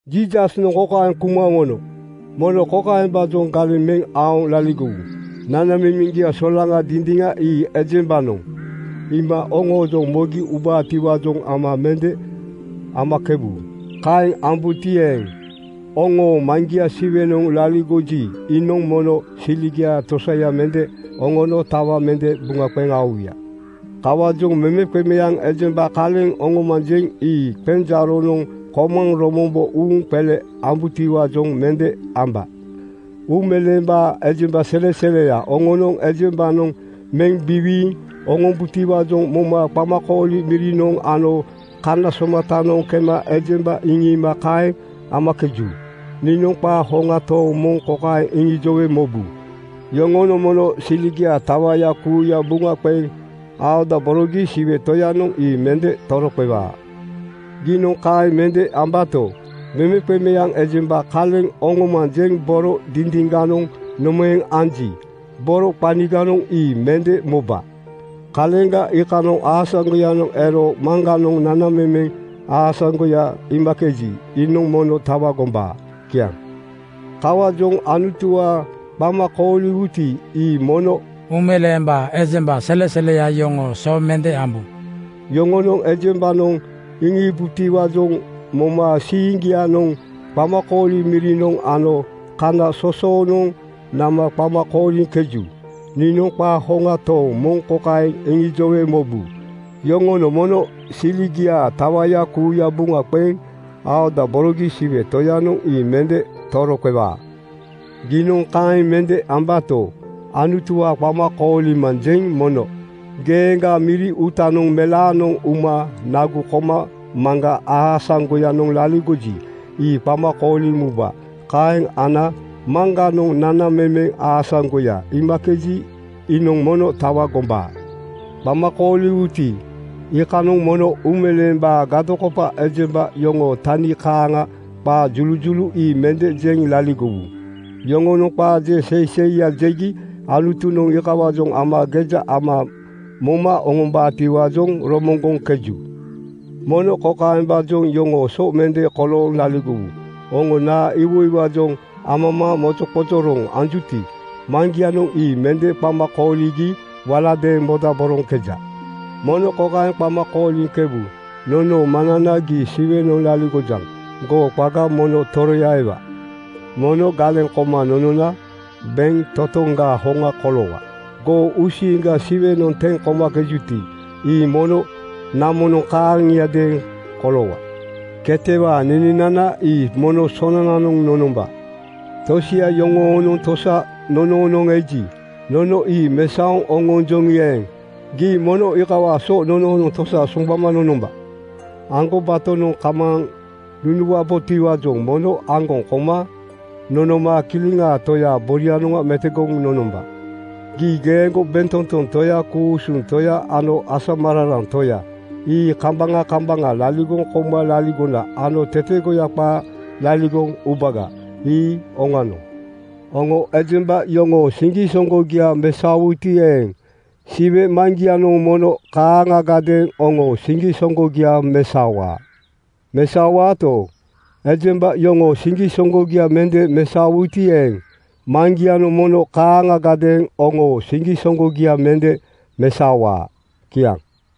Jiisasnoŋ kokaeŋ kuma oŋono, “Mono kokaembaajoŋ galeŋ meŋ aoŋ laligowu: Nanamemeŋgia solaŋa dindiŋa ii ejembanoŋ iima oŋoojoŋ mogi ubaatiwaajoŋ ama mende amakebu. Kaeŋ amakebuti eeŋ, oŋoo Maŋgia Siwenoŋ laligoji, iinoŋ mono siligiaa tosaya mende oŋono tawa mende buŋa qeŋ aowuya. “Kawaajoŋ memeqemeaŋ ejemba kaleŋ oŋomanjeŋ ii qenjaaronoŋ komaŋ romombo uuŋ qele ambutiwaajoŋ mende amba. Uumeleembaa ejemba seleseleya yoŋonoŋ ejembanoŋ meŋ biwiiŋ oŋombutiwaajoŋ moma qamakooli mirinoŋ ano kana somatanoŋ kema ejemba iŋiima kaeŋ amakeju. Niinoŋ qaa hoŋa tooŋ moŋ kokaeŋ iŋijowe mobu, Yoŋonoŋ mono siligiaa tawaya kuuya buŋa qeŋ aodaborogi Siwe Toyanoŋ ii mende toroqewaa. “Giinoŋ kaeŋ mende ambato, memeqemeaŋ ejemba kaleŋ oŋomanjeŋ boro dindiŋganoŋ nomaeŋ anji, boro qaniganoŋ ii mende moba. Kaleŋga iikanoŋ aasaŋgoyanoŋ ero Maŋganoŋ nanamemeŋ aasaŋgoya iimakeji, iinoŋ mono tawa gombaa.” Kiaŋ. “Kawaajoŋ Anutuwaa qama kooliwuti, ii mono uumeleembaa ejemba seleseleya yoŋoo so mende ambu. Yoŋonoŋ ejembanoŋ iŋiibutiwaajoŋ moma siiŋgianoŋ qamakooli mirinoŋ ano kana sosoonoŋ nama qama kooliŋkeju. Niinoŋ qaa hoŋa tooŋ moŋ kokaeŋ iŋijowe mobu, Yoŋonoŋ mono siligiaa tawaya kuuya buŋa qeŋ aodaborogi Siwe Toyanoŋ ii mende toroqewaa. “Giinoŋ kaeŋ mende ambato, Anutuwaa qama koolimanjeŋ mono geeŋgaa miri uuta melaanoŋ uma nagu koma Maŋga aasaŋgoyanoŋ laligoji, ii qama kooliŋ muba. Kaeŋ ana Maŋganoŋ nanamemeŋ aasaŋgoya iimakeji, iinoŋ mono tawa gombaa. “Qama kooliwuti, iikanoŋ mono uumeleembaa gadokopa ejemba yoŋoo tani kaaŋa qaa julujulu ii mende jeŋ laligowu. Yoŋonoŋ qaa je seiseiya jegi Anutunoŋ iikawaajoŋ ama geja ama moma oŋombaatiwaajoŋ romoŋgoŋkeju. Mono kokaembaajoŋ yoŋoo so mende kolooŋ laligowu: Oŋo naa iwoiwaajoŋ amamaaŋ mozoqozoroŋ anjuti, Maŋgianoŋ ii mende qama kooligi waladeeŋ modaboroŋkeja. Mono kokaeŋ qama kooliŋkebu: Nonoo Maŋnana, gii Siwenoŋ laligojaŋ. Goo qaga mono toroya ewa. Mono galeŋ koma nonona bentotoŋgaa hoŋa koloowa. Goo uusiiŋga Siwenoŋ teŋ komakejuti, ii mono namonoŋ kaaŋiadeeŋ koloowa. Ketewaa nenenana ii mono sonananoŋ nonomba. Tosia yoŋoonoŋ tosa nonoonoŋ eji, nono ii mesaoŋ oŋonjoŋi eeŋ, gii mono iikawaa so nonoonoŋ tosa soŋgbama nonomba. Aŋgobatonoŋ kamaaŋ nunuwabotiwaajoŋ mono aŋgoŋ koma nonoma Kileŋaa Toyaa borianoŋga metogoŋ nonomba. (Gii geeŋgo bentotoŋ Toya, ku-usuŋ Toya ano asamararaŋ Toya ii kambaŋa kambaŋa laligoŋ kouma laligona ano tetegoya qaa laligoŋ ubaga. Ii oŋanoŋ.) Oŋo ejemba yoŋoo siŋgisoŋgogia mesaowuti eeŋ, Siwe Maŋgianoŋ mono kaaŋagadeeŋ oŋoo siŋgisoŋgogia mesaowaa. Mesaowaato, ejemba yoŋoo siŋgisoŋgogia mende mesaowuti eeŋ, Maŋgianoŋ mono kaaŋagadeeŋ oŋoo siŋgisoŋgogia mende mesaowaa. Kiaŋ.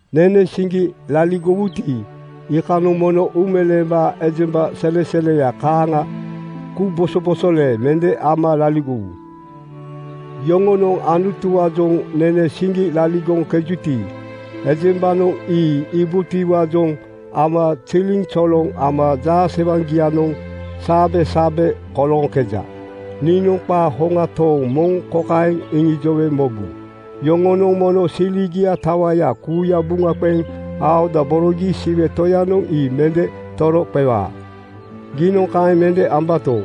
“Nene siŋgi laligowuti, iikanoŋ mono uumeleembaa ejemba seleseleya kaaŋa kubosobosole mende ama laligowu. Yoŋonoŋ Anutuwaajoŋ nene siŋgi laligoŋkejuti, ejembanoŋ ii iibutiwaajoŋ ama ziliŋzoloŋ ama jaasewaŋgianoŋ saabesaabe kolooŋkeja. Niinoŋ qaa hoŋa tooŋ moŋ kokaeŋ iŋijowe mobu, Yoŋonoŋ mono siligiaa tawaya kuuya buŋa qeŋ aodaborogi Siwe Toyanoŋ ii mende toroqewaa. “Giinoŋ kaeŋ mende ambato,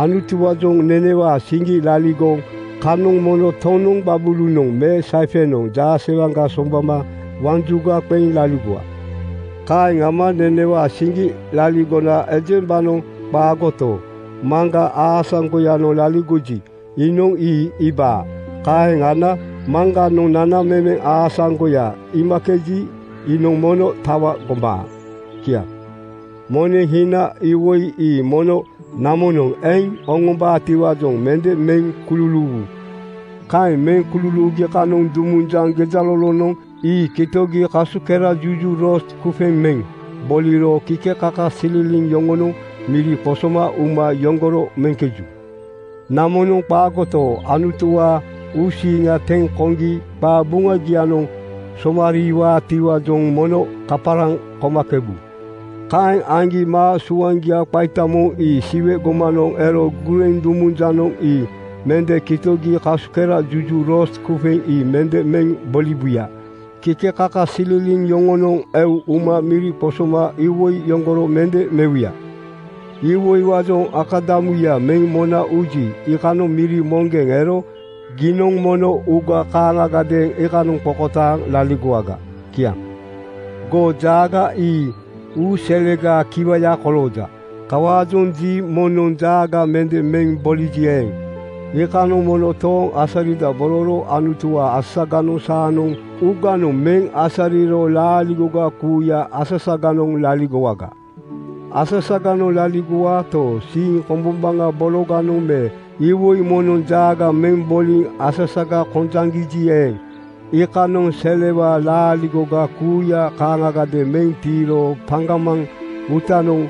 Anutuwaajoŋ nenewaa siŋgi laligoŋ kanoŋ mono tonoŋ gbabulunoŋ me saifenoŋ jaasewaŋga soŋgbama waŋ juga qeŋ laligowa. Kaeŋ ama nenewaa siŋgi laligona ejembanoŋ qaagoto, Maŋga aasaŋgoyanoŋ laligoji, iinoŋ ii iibaa. Kaeŋ ana Maŋganoŋ nanamemeŋ aasaŋgoya iimakeji, iinoŋ mono tawa gombaa. Kiaŋ. “Moneŋ hina iwoi ii mono namonoŋ eŋ oŋombaatiwaajoŋ mende meŋ kululuuwu. Kaeŋ meŋ kululuugi kanoŋ dumunjaŋ gejalolonoŋ ii kitogi kasukerajuju rost (kufeŋ) meŋ boliro kikekakasililiŋ yoŋonoŋ miri qosoma uma yoŋgoro meŋkeju. “Namonoŋ qaagoto, Anutuwaa uusiiŋa teŋ koŋgi qabuŋagianoŋ somariiwaatiwaajoŋ mono kaparaŋ komakebu. Kaeŋ aŋgi maa suaŋgia qaita moŋ ii Siwe gomanoŋ ero gureŋ dumunjanoŋ ii mende kitogi kasukerajuju rost (kufeŋ) ii mende meŋ boliwuya. Kikekakasililiŋ yoŋonoŋ eu uma miri qosoma iwoi yoŋgoro mende mewuya. Iwoiwaajoŋ akadamuya meŋ mona uji, iikanoŋ miri moŋgeŋ ero giinoŋ mono uuga kaaŋagadeeŋ iikanoŋ qokotaaŋ laligowaga. Kiaŋ. “Goo jaaga ii uu selegaa kiwaya kolooja. Kawaajoŋ ji moŋnoŋ jaaga mende meŋ boliji eeŋ, iikanoŋ mono tooŋ asaridabororo Anutuwaa asasaganoŋ saanoŋ uuganoŋ meŋ asariro laaligoga kuuya asasaganoŋ laligowaga. “Asasaganoŋ laligowaato, siiŋ kombombaŋa bologanoŋ me iwoi moŋnoŋ jaaga meŋ boliŋ asasaga kojaŋgiji eeŋ, iikanoŋ selewaa laaligoga kuuya kaaŋagadeeŋ meŋ tiiro paŋgamaŋ uutanoŋ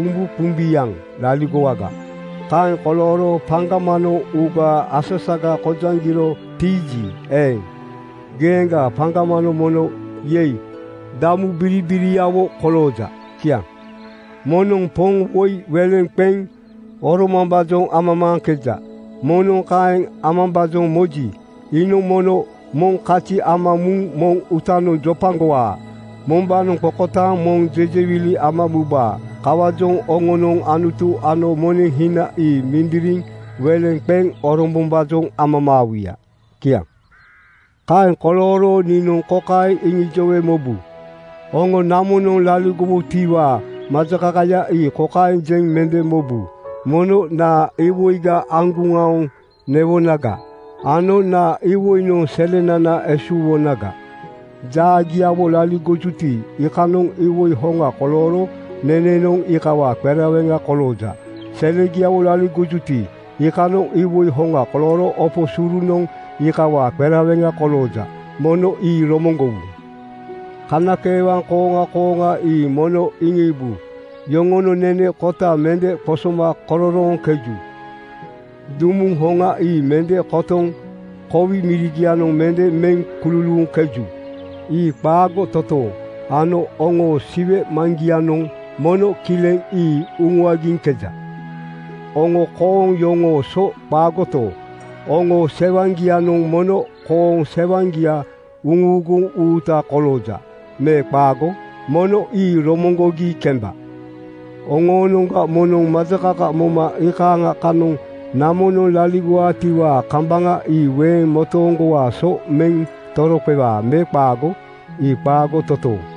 umbuqumbiaŋ laligowaga. Kaeŋ kolooro paŋgamanoŋ uugaa asasaga kojaŋgiro tiiji eeŋ, geeŋgaa paŋgamanoŋ mono ‘Yei!’ damubiribiriawo kolooja. Kiaŋ. “Moŋnoŋ poŋ woi weleŋ qeŋ oromambaajoŋ amamaaŋkeja. Moŋnoŋ kaeŋ amambaajoŋ moji, iinoŋ mono moŋ kazi ama muŋ moŋ uutanoŋ jopagowaa. Mombaanoŋ qokotaaŋ moŋ jejewili ama mubaa. Kawaajoŋ oŋonoŋ Anutu ano moneŋ hina ii mindiriŋ weleŋ qeŋ orombombaajoŋ amamaawuya. Kiaŋ. “Kaeŋ kolooro niinoŋ kokaeŋ iŋijowe mobu: Oŋo namonoŋ laligowutiwaa majakakaya ii kokaeŋ jeŋ mende mobu, ‘Mono naa iwoiga aŋguŋ aoŋ newonaga ano naa iwoinoŋ selenana esuuwonaga?’ Jaagiawo laligojuti, iikanoŋ iwoi hoŋa kolooro nenenoŋ iikawaa qereweŋa kolooja. Selegiawo laligojuti, iikanoŋ iwoi hoŋa kolooro opo surunoŋ iikawaa qereweŋa kolooja. Mono ii romoŋgowu. “Kanakeewaŋ kooŋa kooŋa ii mono iŋiibu. Yoŋonoŋ nene kota mende qosoma kororooŋkeju. Dumuŋ hoŋa ii mende kotoŋ kowi mirigianoŋ mende meŋ kululuuŋkeju. Ii qaago totooŋ ano oŋoo Siwe Maŋgianoŋ mono kileŋ ii uŋuagiŋkeja. Oŋo kooŋ yoŋoo so qaagoto, oŋoo sewaŋgianoŋ mono kooŋ sewaŋgia uŋuuguŋ uuta kolooja me qaago? Mono ii romoŋgogi kemba. “Oŋoonoŋga moŋnoŋ majakaka moma iikaaŋa kanoŋ namonoŋ laligowaatiwaa kambaŋa ii weeŋ motooŋgowaa so meŋ toroqewaa me qaago? Ii qaago totooŋ!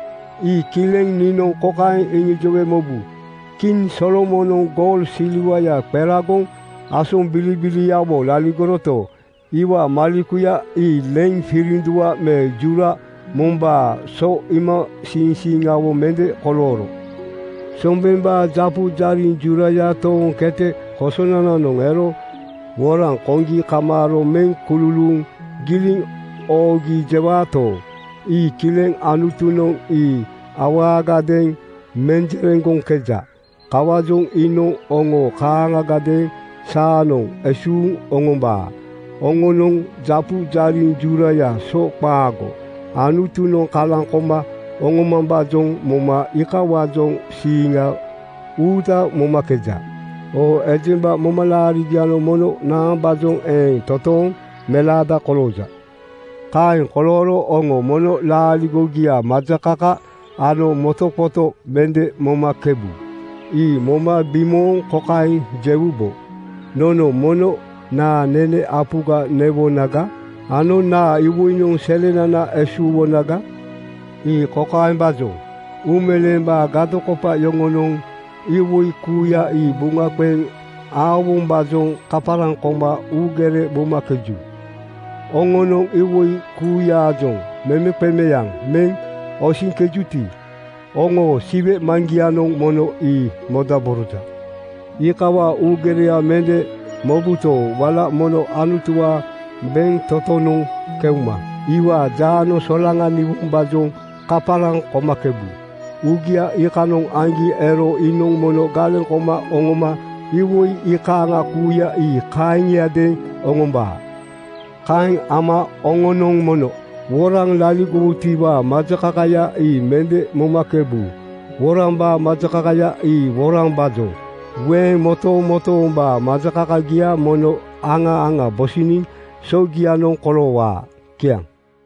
“Ii kileŋ niinoŋ kokaeŋ iŋijowe mobu, Kiŋ Solomonoŋ goul silwaya qeragoŋ asombilibiliawo laligoroto, iwaa malekuya ii leiŋ firindua me jura mombaa so iimasiiŋsiiŋawo mende kolooro. Sombembaa japu jariŋ juraya tooŋ kete kosonananoŋ ero woraŋ koŋgi kamaaro meŋ kululuuŋ giliŋ oogi jewaato, ii kileŋ Anutunoŋ ii awaagadeeŋ menjereŋgoŋkeja. Kawaajoŋ iinoŋ oŋo kaaŋagadeeŋ saanoŋ esuuŋ oŋombaa. Oŋonoŋ japu jariŋ jurayaa so qaago. Anutunoŋ kalaŋ koma oŋomambaajoŋ moma iikawaajoŋ siiŋa uuta momakeja. Oo ejemba, momalaarigianoŋ mono naambaajoŋ eeŋ toontooŋ melaada kolooja? “Kaeŋ kolooro oŋo mono laaligogiaa majakaka ano motoqoto mende momakebu. Ii moma bimooŋ kokaeŋ jewubo, ‘Nono mono naa nene apuga newonaga?’ ano ‘Naa iwoinoŋ selenana esuuwonaga?’ “Ii kokaembaajoŋ: Uumeleembaa gadokopa yoŋonoŋ iwoi kuuya ii buŋa qeŋ aowombaajoŋ kaparaŋ koma uugere momakeju. Oŋonoŋ iwoi kuuyaajoŋ memeqemeaŋ meŋ osiŋkejuti, oŋoo Siwe Maŋgianoŋ mono ii modaboroja. Iikawaa uugereya mende mobuto, wala mono Anutuwaa bentotonoŋ keuma iwaa jaanoŋ solaŋaniwombaajoŋ kaparaŋ komakebu. Uugia iikanoŋ aŋgi ero iinoŋ mono galeŋ koma oŋoma iwoi iikaaŋa kuuya ii kaaŋiadeeŋ oŋombaa. “Kaeŋ ama oŋonoŋ mono woraŋ laligowutiwaa majakakaya ii mende momakebu. Worambaa majakakaya ii worambaajoŋ. Weeŋ motomotoombaa majakakagia mono aŋa aŋa bosiniŋ sogianoŋ koloowaa.” Kiaŋ.